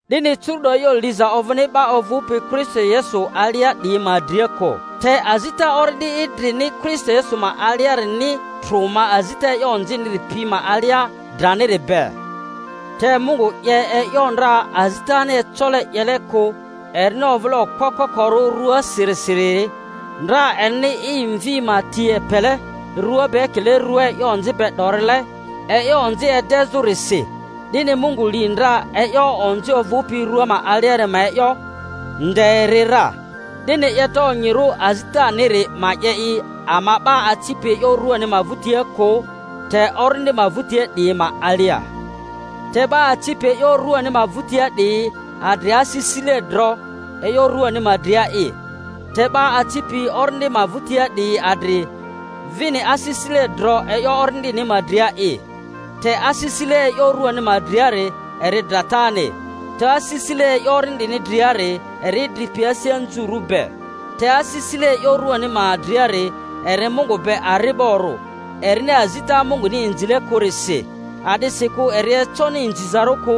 'Dini curu’do e'yo liza ovᴜni 'ba ovᴜpi Kristo Yesu alia 'diyi ma dria kᴜ. Te azita Orindi idrini Kristo Yesu ma aliarini trᴜ ma azita e'yo onziniri pi ma alia draniri be. Te Mungu 'ye e'yo ndra azitani ecole 'yele kᴜ erini ovᴜle okpo kokorᴜ ruasirisiri, ndra erini i Mvi ma ti epele rua be ekile rᴜa e'yo onzi be 'dorile e'yo onzi edezᴜrisi; 'dini Mungu li ndra e'yo onzi ovᴜpi rᴜa ma aliari ma e'yo, nde eri ra, 'dini 'yeta onyirᴜ azitaniri ma 'ye i ama 'ba acipi e'yo ruani ma vᴜtia kᴜ, te Orindi ma vᴜtia 'diyi ma alia. Te 'ba acipi e'yo ruani ma vᴜtia 'diyi adri asisile dro e'yo ruani ma dria'i, te 'ba acipi Orindi ma vᴜtia 'diyi adri vini asisile dro e'yo Ori-ndini ma dria'i. Te asisile e'yo ruani ma driari eri dratani, te asisile e'yo Orindini driari eri idri pi asi anzurᴜ be. Te asisile e'yo ruani ma driari eri Mungu be ari'borᴜ; erini azita Munguni inzile kᴜrisi, a'disikᴜ eri econi inzizarᴜ kᴜ;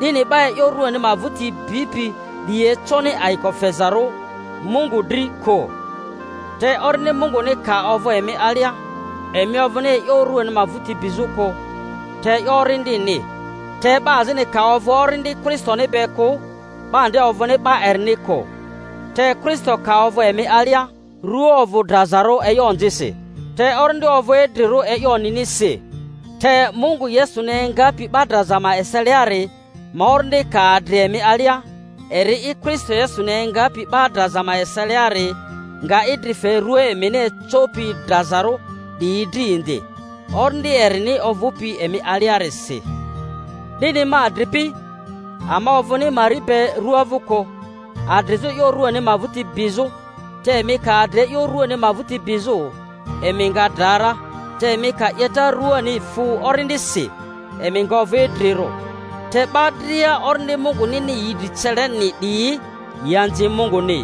'dini 'ba e'yo ruani ma vᴜti bipi 'diyi econi ayiko fezarᴜ Mungu dri kᴜ. Te Orindi Munguni ka ovᴜ emi alia, emi ovᴜni e'yo ruani ma vᴜti bizᴜ kᴜ te e'yo Orindini. Te 'ba azini ka ovᴜ Orindi Kristoni be kᴜ, 'ba nde ovᴜni 'ba erini kᴜ. Te Kristo ka ovᴜ emi alia, rᴜa ovᴜ drazarᴜ e'yo onzisi, te orindi ovᴜ idrirᴜ e'yo onyinisi. Te Mungu Yesuni engapi 'ba draza ma eseliari ma Orindi ka adri emi alia, eri'i Kristo Yesuni engapi 'ba draza ma eseliari nga idri fe rua emini ecopi drazarᴜ 'diyi dri indi, Orindi erini ovᴜpi emi aliarisi. 'Dini, ma adripi, ama ovᴜni mari be rᴜa vᴜ kᴜ, adrizᴜ e'yo ruani ma vᴜti bizᴜ te emi ka adri e'yo ruani ma vᴜti bizᴜ emi nga dra ra, te emi ka 'yeta ruani fu Orindisi emi nga ovᴜ idrirᴜ. Te 'ba dria Orindi Mungunini yi dri celeni 'diyi yi anzi Munguni.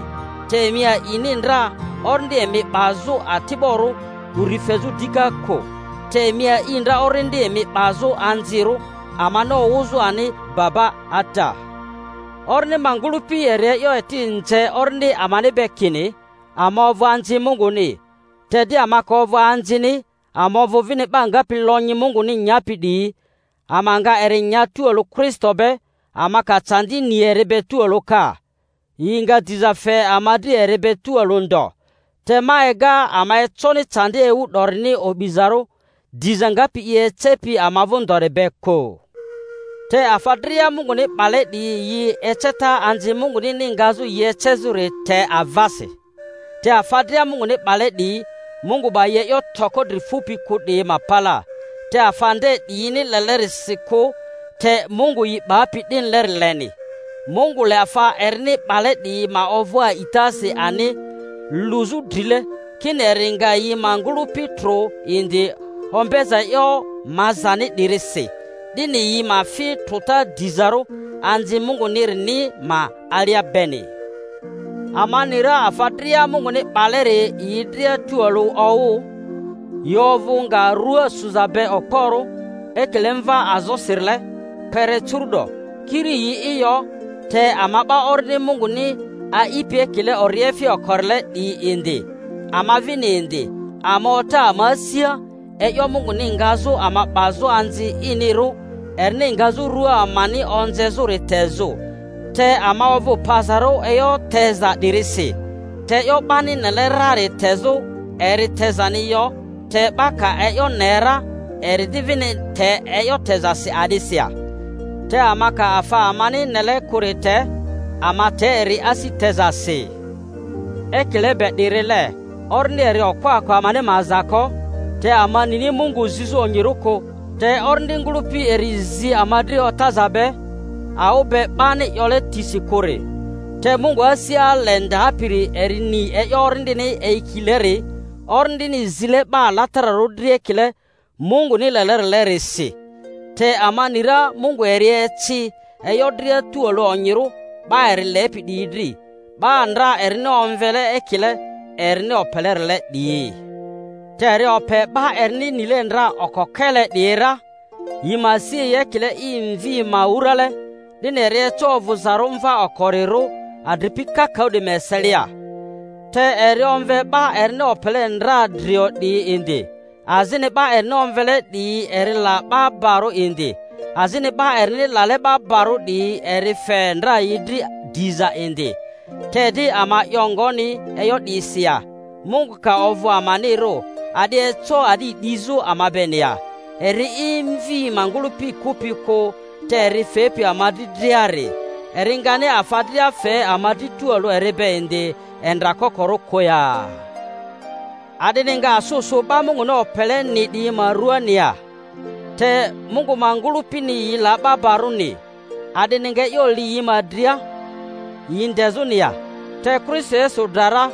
Te emi a'ini ndra orindi emi 'bazᴜ ati'borᴜ uri fezᴜ dika kᴜ, te emi a'i ndra orindi emi 'bazᴜ anzirᴜ, amani owᴜzᴜ ani, Baba! Ata! Orindi ma ngᴜlᴜpi eri e'yo eti nze orindi amani be kini ama ovᴜ anzi Munguni. Te di ama ka ovᴜ anzini ama ovᴜ vini 'ba ngapi lonyi Munguni nyapi 'diyi, ama nga eri nya tualᴜ Kristo be, ama ka candi ni eri be tualᴜ ka, yi nga diza fe ama dri eri be tualᴜ ndo. Te ma ega ama econi candi ewu 'dorini o'bizarᴜ diza ngapi i ecepi ama vᴜ ndori be kᴜ. Te afa dria Munguni 'bale 'diyi yi eceta anzi Mungunini ngazᴜ yi ecezᴜri te avasi; te afa dria Munguni 'bale 'diyi, Mungu 'ba yi e'yo toko dri fupi kᴜ 'diyi ma palaa, te afa nde 'diyini lelerisi kᴜ te Mungu yi 'bapi 'dinileri leni. Mungu le afa erini 'bale 'diyi ma ovᴜ a'itasi ani luzᴜ drile, kini eri nga yi ma ngᴜlᴜpi trᴜ indi ombeza e'yo mazani 'dirisi, 'dini yi ma fi trᴜta dizarᴜ anzi Mungunirini ma alia beni. Ama ni ra afa dria Munguni 'baleri yi dria tualᴜ owᴜ, yi ovᴜ nga rᴜa suza be okporᴜ ekile mva azosirile, kpere curu'do; kiri yi'i yo, te ama 'ba Orindi Munguni a'ipi ekile oriefi okorile 'diyi indi, ama vini indi, ama ota ama asia, e'yo Munguni ngazᴜ ama 'bazᴜ anzi inirᴜ, erini ngazᴜ rᴜa amani onzezᴜri tezᴜ. Te ama ovᴜ pazarᴜ e'yo teza 'dirisi. Te e'yo 'bani nele rari tezᴜ eri tezani yo. Te 'ba ka e'yo ne ra, eri di vini te e'yo tezasi a'disi ya? Te ama ka afa amani nele kᴜri te, ama te eri asi tezasi. Ekile be 'dirile Orindi eri okpo-ako amani ma aza ko; te ama nini Mungu zizᴜ onyirᴜ kᴜ, te Orindi ngᴜlᴜpi eri zi ama dri otaza be, awᴜ be 'bani 'yole tisi kᴜri. Te Mungu asi ale ndapiri eri ni e'yo Orindini eyikileri, Orindini zile 'ba alatararᴜ dri ekile Munguni lelerile-risi. Te ama ni ra Mungu eri eci e'yo dria tualᴜ onyirᴜ 'ba eri lepi 'diyi dri, 'ba ndra erini omvele ekile erini opelerile 'diyi. Te eri ope 'ba erini nile ndra okokele 'diyi ra, yi ma si yi ekile i Mvi ma wurale, 'dini eri eco ovᴜzarᴜ mva okoriro adripi kakaᴜ 'diyi ma eselia. Te eri omve 'ba erini opele ndra drio 'diyi indi; azini 'ba erini omvele 'diyi eri la 'ba barᴜ indi; azini 'ba erini lale 'ba barᴜ 'diyi eri fe ndra yi dri diza indi. Te di ama 'yo ngoni e'yo 'diyisi ya? Mungu ka ovᴜ amanirᴜ, a'di eco a'di 'dizᴜ ama beni ya? Eri'i i Mvi ma ngᴜlᴜpi kᴜpi kᴜ, te eri fepi ama dri driari, eri ngani afa dria fe ama dri tualᴜ eri be indi endra kokorᴜ kᴜ ya? A'dini nga asᴜ sᴜ 'ba Munguni opeleni 'diyi ma ruaani ya? Te Mungu ma ngᴜlᴜpini yi la 'ba barᴜni; a'dini nga e'yo li yi ma dria yi ndezᴜni ya? Te Kristo Yesu dra ra,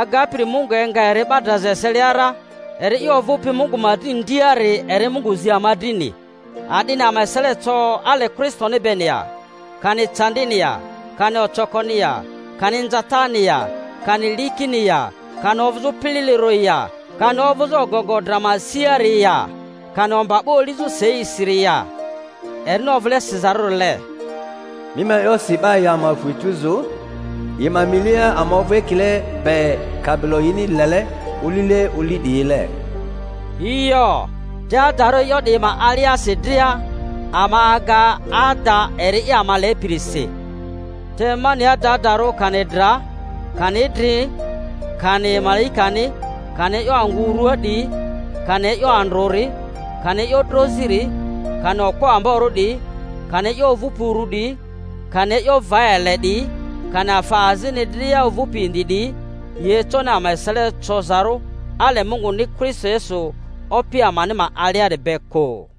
agapiri Mungu enga eri 'ba draza eselia ra, eri'i ovᴜpi Mungu ma dri ndiari, eri Mungu zi ama drini. A'dini ama esele co ale Kristoniri beni ya? Kani candini ya? Kani ocokoni ya? Kani inzatani ya? Kani likini ya? Kani ovᴜzᴜ pililirᴜri ya? Kani ovᴜzᴜ ogogo dra ma siari ya? Kani omba 'ba olizᴜ seisiri ya? Erini ovᴜle sizarᴜrile, Mi ma e'yosi 'ba yi ama fu etuzu; yi ma milia ama ovᴜ ekile be kabilo yini lele olile oli 'diyile. Yo, te adarᴜ e'yo 'diyi ma aliasi dria ama aga ada eri'i ama lepirisi. Te ma ni adadarᴜ kani dra, kani idri, kani malaikani, kani e'yo angᴜ urua 'diyi, kani e'yo andrᴜri, kani e'yo droziri, kani okpo amborᴜ 'diyi, kani e'yo ovᴜpi uru 'diyi, kani e'yo va ele 'diyi, kani afa azini dria ovᴜpi indi 'diyi, yi econi ama esele cozarᴜ ale Munguni Kristo Yesu Opi amani ma aliari be kᴜ.